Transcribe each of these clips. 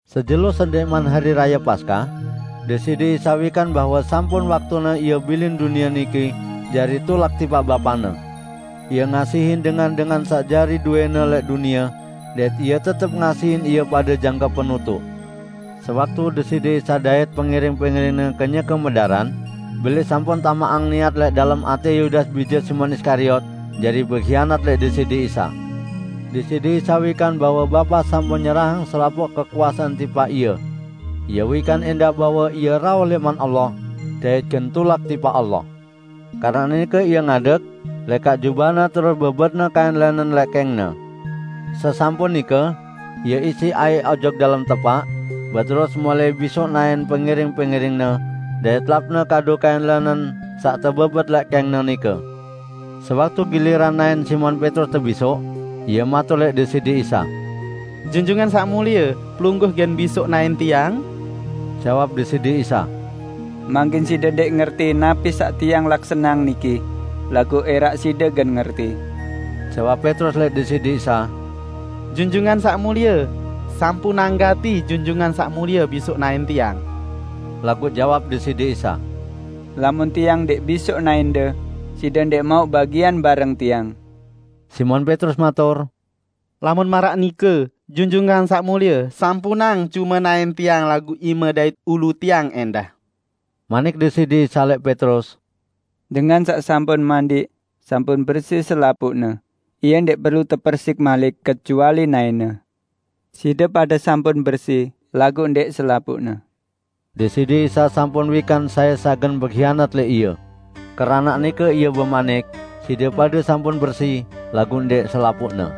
Sejelo sendẽqman Hari Raye Paskah, Deside Isa wikan bahwe sampun waktune Ie bilin dunie niki jari tulak tipaq Bapa-Ne. Ie ngasihin dengan-dengan saq jari dowẽ-Ne lẽq dunie, dait Ie tetep ngasihin ie pade jangke penutuq. Sewaktu Deside Isa dait pengiring-pengiring-Ne kenyeke medaran, Belis sampun tamaqang niat lẽq dalem atẽ Yudas bije Simon Iskariot jari behianat lẽq Deside Isa. Deside Isa wikan bahwe Bapa sampun nyerahang selapuq kekuasean tipaq Ie. Ie wikan ẽndah bahwe Ie rauh lẽman Allah dait gen tulak tipaq Allah. Keranaq nike Ie ngadeg, lekaq jubah-Ne terus bebet-Ne kain lẽnen lẽq kẽng-Ne. Sesampun nike, Ie isiq aiq ojok dalem tepaq, beterus mulai bisoq naẽn pengiring-pengiring-Ne dait lapne kadu kain lẽnen saq tebebet lẽq kẽng-Ne nike. Sewaktu giliran naẽn Simon Petrus tebisoq, ie matur lẽq Deside Isa, "Junjungan Saq Mulie, Pelungguh gen bisoq naẽn tiang?" Jawab Deside Isa, "Mangkin side ndẽq ngerti napi saq Tiang laksaneang niki, laguq ẽraq side gen ngerti." Jawab Petrus lẽq Deside Isa, "Junjungan Saq Mulie, sampunang gati Junjungan Saq Mulie bisoq naẽn tiang!" Laguq jawab Deside Isa, "Lamun Tiang ndẽq bisoq naẽnde, side ndẽq mauq bagian bareng Tiang." Simon Petrus matur, "Lamun maraq nike, Junjungan Saq Mulie, sampunang cume naẽn tiang laguq ime dait ulu tiang ẽndah!" Manik Deside Isa lẽq Petrus, "Dengan saq sampun mandiq, sampun bersi selapuqne Ie ndẽq perlu tepersiq malik; kecuali naẽne. Side pade sampun bersi, laguq ndẽq selapuqne." ( Deside Isa sampun wikan sai saq gen behianat lẽq Ie. Keranaq nike Ie bemanik, "Side pade sampun bersi, laguq ndẽq selapuqne.")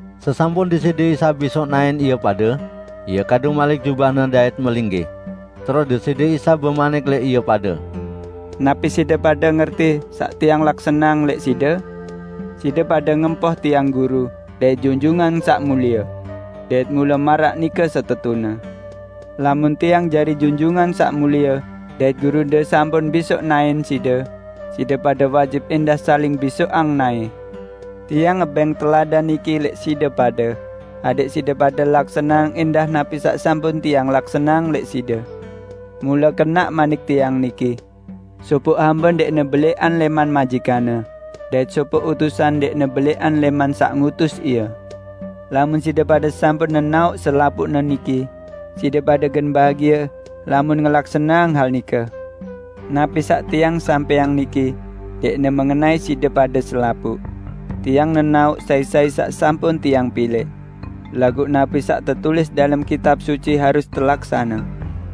Sesampun Deside Isa bisoq naẽn ie pade, Ie kadu malik jubah-Ne dait melinggih. Terus Deside Isa bemanik lẽq ie pade, "Napi side pade ngerti saq Tiang laksaneang lẽq side? Side pade ngempoh Tiang Guru dait Junjungan Saq Mulie. Dait mule maraq nike setetune. Lamun Tiang jari Junjungan Saq Mulie dait Gurunde sampun bisoq naẽn side, side pade wajib ẽndah saling bisoqang naẽ. Tiang ngebẽng teladan niki lẽq side pade, adẽq side pade laksaneang ẽndah napi saq sampun Tiang laksaneang lẽq side. Mule kenaq manik Tiang niki: Sopoq hambe ndẽqne belẽqan lẽman majikanne, dait sopoq utusan ndẽqne belẽqan lẽman saq ngutus ie. Lamun side pade sampun nenaoq selapuqne niki, side pade gen bahagie lamun ngelaksaneang hal nike. Napi saq Tiang sampẽang niki ndẽqne mengenai side pade selapuq. Tiang nenaoq sai-sai saq sampun Tiang pilẽq. Laguq napi saq tetulis dalem Kitab Suci, harus telaksane,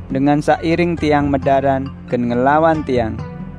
'Dengan saq iring Tiang medaran, gen ngelawan Tiang.'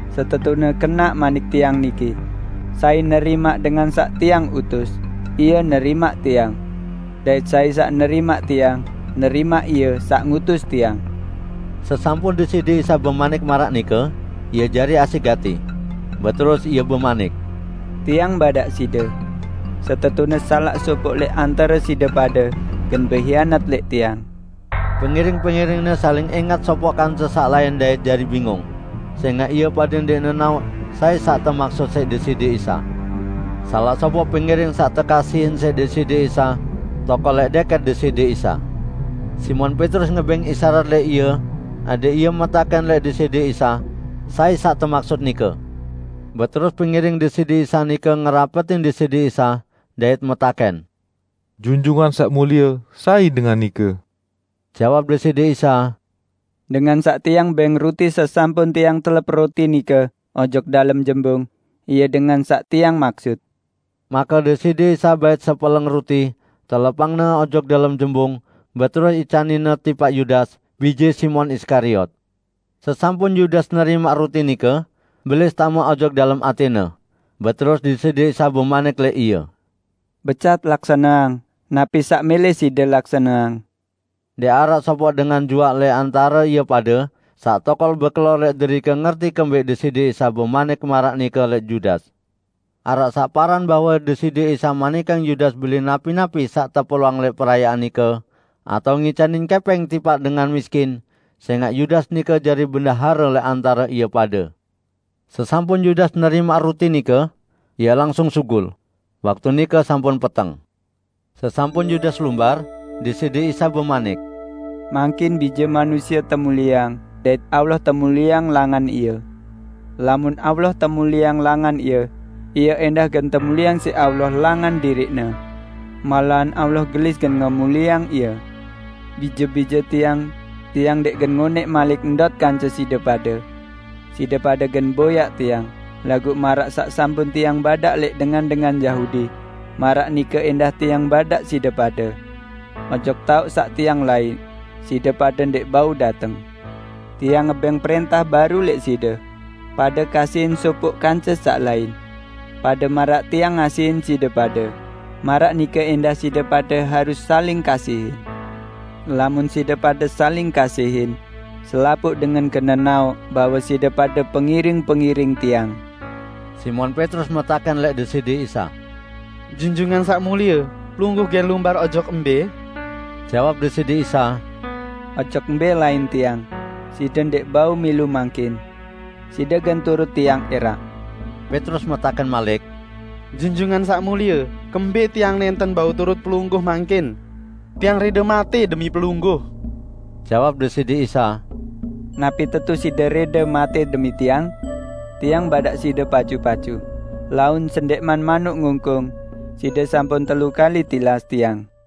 Setetune kenaq manik Tiang niki: Sai nerimaq dengan saq Tiang utus, ie nerimaq Tiang. Dait sai saq nerimaq Tiang, nerimaq Ie saq ngutus Tiang." Sesampun Deside Isa bemanik maraq nike, Ie jari asẽq gati. Beterus Ie bemanik, "Tiang badaq side, setetune salaq sopoq lẽq antare side pade gen behianat lẽq Tiang." Pengiring-pengiring-Ne saling ẽngat sopoq kance saq lain dait jari bingung, sẽngaq ie pade ndẽq nenaoq sai saq temaksut siq Deside Isa. Salaq sopoq pengiring saq tekasihin siq Deside Isa tokol lẽq dẽkẽt Deside Isa. Simon Petrus ngebẽng isarat lẽq ie adẽq ie metakẽn lẽq Deside Isa sai saq temaksut nike. Beterus pengiring Deside Isa nike ngerapetin Deside Isa, dait metakẽn, "Junjungan Saq Mulie, sai dengan nike?" Jawab Deside Isa, "Dengan saq Tiang bẽng ruti sesampun Tiang telep ruti nike ojok dalem jembung, ie dengan saq Tiang maksut." Make Deside Isa bait sepeleng ruti, telepangne ojok dalem jembung; beterus icanin-Ne tipaq Yudas, bije Simon Iskariot. Sesampun Yudas nerimaq ruti nike, Belis tame ojok dalem atẽne. Beterus Deside Isa bemanik lẽq ie, "Becat laksaneang napi saq mẽlẽ side laksaneang." Ndẽq araq sopoq dengan juaq lẽq antare ie pade saq tokol bekelor lẽq derike ngerti kembẽq Deside Isa bemanik maraq nike lẽq Yudas. Araq saq paran bahwe Deside Isa manikang Yudas beli napi-napi saq teperluang lẽq perayaan nike, atao ngicanin kẽpẽng tipaq dengan miskin -- sẽngaq Yudas nike jari bendahare lẽq antare ie pade. Sesampun Yudas nerimaq ruti nike, ie langsung sugul. Waktu nike sampun peteng. Sesampun Yudas lumbar, Deside Isa bemanik, "Mangkin Bije Manusie temulieang dait Allah temulieang langan Ie. Lamun Allah temulieang langan Ie, Ie ẽndah gen temulieang siq Allah langan diriq-Ne. Malahan Allah gelis gen ngemulieang Ie. Bije-bije Tiang, Tiang ndẽq gen ngonẽq malik ndot kance side pade. Side pade gen boyaq Tiang, laguq maraq saq sampun Tiang badaq lẽq dengan-dengan Yahudi, maraq nike ẽndah Tiang badaq side pade; ojok taoq saq Tiang laiq, side pade ndẽq bau dateng. Tiang ngebẽng prẽntah baru lẽq side: Pade kasihin sopoq kance saq lain. Pade maraq Tiang ngasihin side pade, maraq nike ẽndah side pade harus saling kasihin. Lamun side pade saling kasihin, selapuq dengan gen nenaoq bahwe side pade pengiring-pengiring Tiang." Simon Petrus metakẽn lẽq Deside Isa, "Junjungan Saq Mulie, Pelungguh gen lumbar ojok mbẽ?" Jawab Deside Isa, "Ojok mbẽ lain Tiang, side ndẽq bau milu mangkin. Side gen turut Tiang ẽraq." Petrus metakẽn malik, "Junjungan Saq Mulie, kembẽq tiang nẽnten bau turut Pelungguh mangkin? Tiang rẽde matẽ demi Pelungguh!" Jawab Deside Isa, "Napi tetu side rẽde matẽ demi Tiang? Tiang badaq side pacu-pacu, laun sendẽqman manuk ngungkung, side sampun telu kali tilas Tiang!"